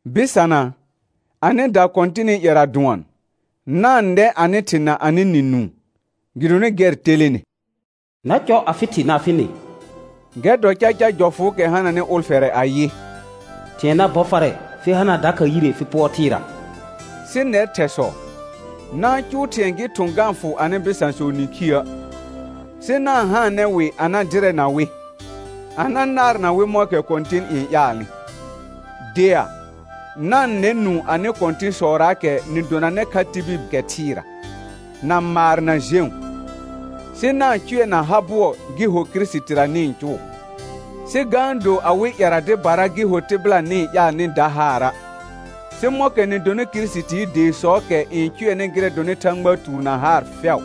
Bɩsana, anɩda Kɔ̃tɩnɩ ƴɛra dʋɔn, na-n nɛ anɩ thɩ na anɩ nɩ nũu, gɩdonɩ gɛr telene. «Na cɔ afɩ thɩ na afɩ nɩ», gɛr dɔ caca jɔfʋʋkɛ hananɩ ʋlfɛrɛ ayɩ: «Thɩ̃ɛ na bɔ farɛ fɩ hana dakha yire fɩ pʋɔr thɩɩra.» Sɩ nɛr thɛsɔ, na-n cʋʋ thɩ̃ɛ gɩ thʋ̃ ga-n fʋ anɩ bɩsãsɔ nĩkhiə', sɩ na-n haanɛ wɩ a na dɩrɛna wɩ, a na naarna wɩ mɔ̃kɛ Kɔ̃tɩn n ƴaalnɩ. Dea, na-n nɛ nũu anɩ kɔ̃tɩ̃sɔraakɛ nɩ donanɩ kha tibil kɛ thɩɩra, na maar na jẽu, sɩ na-n cʋɛ na ha bʋɔ gɩ ho Kirisitira nɩ-n cʋʋ, sɩ ga-n do awɩ ƴɛra dɩbara gɩ ho tɩbɩla nɩ-n ƴaal nɩ da haara', sɩ mɔ̃kɛ nɩ donɩ Kirisitii deesɔɔkɛ n cʋɛnɩ gɩrɛ dɔnɩ Thãgbaa tuur na haar fɛʋ.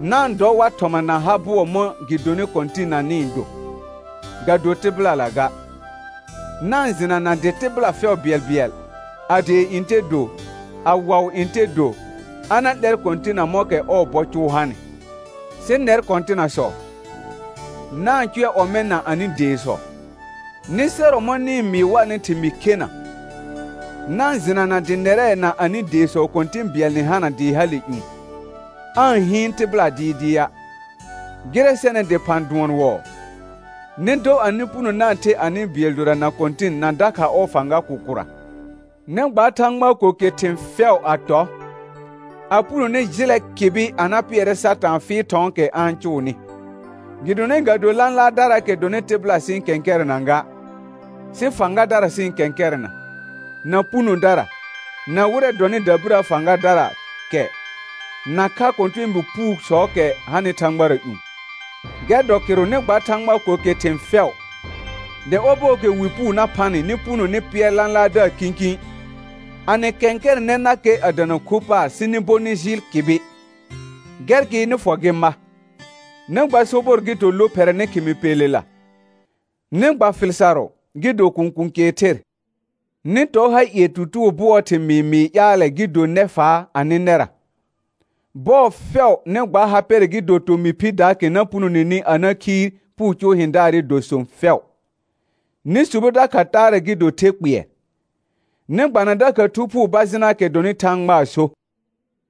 Na-n dɔ war thɔma na ha bʋɔ mɔ̃ gɩ donɩ Kɔ̃tɩnna nɩ-n do, ga do tɩbɩlala ga; na-n jɩnana dɩ tɩbɩla fɛʋ bɩɛlbɩɛl, a dee ntɛ do, a waʋ ntɛ do, a na 'lɛr Kɔ̃tɩnna mɔ̃kɛ ɔɔ bɔ cʋʋ hanɩ. Sɩ nɛr kɔ̃tɩnasɔ, na-n cʋɛ ɔmɛ̃ na anɩ deesɔ; nɩ sɛrɔ mɔ̃ nɩ-n mɩɩ warnɩ thɩmɩɩ khena, na-n jɩnana dɩ nɛrɛ na anɩ deesɔ Kɔ̃tɩ̃ bɩɛl nɩ hana dɩ hale ƴũ, aa-n hɩɩn tɩbɩla dɩɩdɩa'. Gɩrɛ sɛnɩ dɩphã dʋɔn wɔɔ, nɩ dɔ anɩ puno na-n the anɩ bɩɛl dora na Kɔ̃tɩn na dakha ɔɔ fãga kʋkʋra. Nɩ gba Thãgbaa ko ke thɩ̃ fɛʋ a tɔ, a punone jɩlɛ kɩbɩ a na pɩɛrɛ Satãa fɩɩl thɔ̃ɔkɛ a-n cʋʋnɩ. Gɩdonɩ ga do lãlaardaraakɛ dɔnɩ tɩbɩla sɩ-n kɛ̃kɛrɛna ga, sɩ fãgadara sɩ-n kɛ̃kɛrɛna, na punodara, na wɩrɛ dɔnɩ dabirə fãgadara kɛ, nakha kɔ̃tɛɛbi puusɔɔkɛ hanɩ thãgbara ƴũ. Gɛr dɔ kɩrʋ nɩ gba Thãgbaa ko ke thɩ̃ fɛʋ, dɩ ɔbɔɔkɛ wi puu na phanɩ nɩ puno nɩ pɩɛr lãlaardaar kĩkĩ, a nɩ kɛ̃kɛrɛnɛnakɛ a dana khu paar sɩ nɩ bo nɩ jɩɩl kɩbɩ. Gɛr gɩ nɩ fɔ gɩ ma. Nɩ gba sobɔr gɩ do lophɛrɛ nɩ khɩmɩ pelela; nɩ gba fɩl sarʋ gɩ do kũkũ kɛɛ ther; nɩ tɔ ha ie tutugo bʋɔɔ thɩmɩɩ mɩɩ ƴaalɛ gɩ do nɛfaa anɩ nɛra; bɔɔ fɛʋ nɩ gba ha pɛrɛ gɩ do tomɩ phɩdaakɛ na punoneni a na khiir puu cʋʋ hɩ̃daarɩ dɔ sõ fɛʋ; nɩ subo dakha taarɛ gɩ do the kpɩɛr, nɩ gbana dakha Thu Phuu bajɩnaakɛ dɔnɩ Thãgbaa so.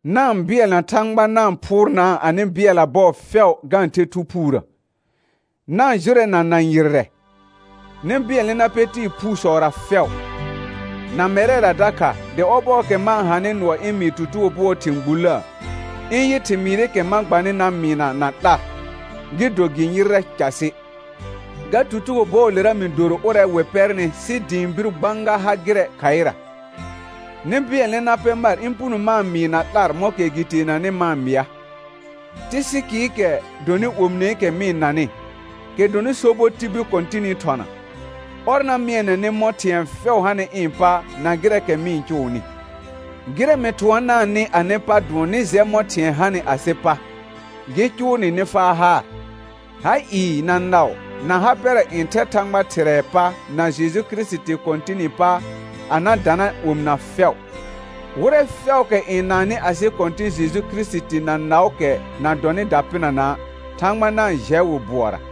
Na-n bɩɛlna Thãgba na-n phʋʋrnaa anɩ bɩɛlla bɔɔ fɛʋ ga-n the Thu Phuurə; na-n jʋrɛna na yɩrrɛ, nɩ bɩɛlnɛ na pɛ tɩɩ phuusɔra fɛʋ, na mɛrɛra dakha dɩ ɔbɔɔkɛ ma-n hanɩ nʋɔ ɩ̃ mɩɩ tutugo bʋɔɔ thɩ̃ gbullə, ɩ̃ yɩ thɩmɩɩrɩkɛ ma gbanɩ na mɩɩna na 'lar, gɩ do gɩ yɩrrɛ casɩ. Ga tutugo bɔɔlera mɩ doro ʋrɛ wɩ pɛrnɩ sɩ dɩ ɩ̃ bir gbãga ha gɩrɛ khaɩra; nɩ bɩɛlnɛ na pɛ mar ɩ̃ puno ma-n mɩɩ na 'lar mɔ̃kɛ gɩ teenanɩ ma-n mɩa. Tɩsɩkɩɩkɛ dɔnɩ omineekɛ mɩ-n nanɩ, kɛ dɔnɩ sobɔ tibil Kɔ̃tɩnɩ thɔna, ɔr na mɩɛnɛ nɩ mɔ̃ thɩ̃ɛ fɛʋ hanɩ ɩ̃ pa na gɩrɛɛkɛ mɩ-n cʋʋnɩ. Gɩrɛ mɩ thʋɔnaanɩ anɩ pa dʋɔn nɩ jɛ mɔ̃ thɩ̃ɛ hanɩ asɩ pa, gɩ cʋʋ nɩ nɩ faa haar. Ha ɩɩ, na naʋ, na ha pɛrɛ n thɛ Thãgba Thɩrɛɛ pa na Jeju Kirisiti Kɔ̃tɩnɩ pa a na dana omɩna fɛʋ. Wɩrɛ fɛʋʋkɛ n naannɩ asɩ Kɔ̃tɩ̃ Jeju Kirisiti na naʋʋkɛ na dɔnɩ dapɩnana', Thãgba na-n jɛ wɩ bʋɔra.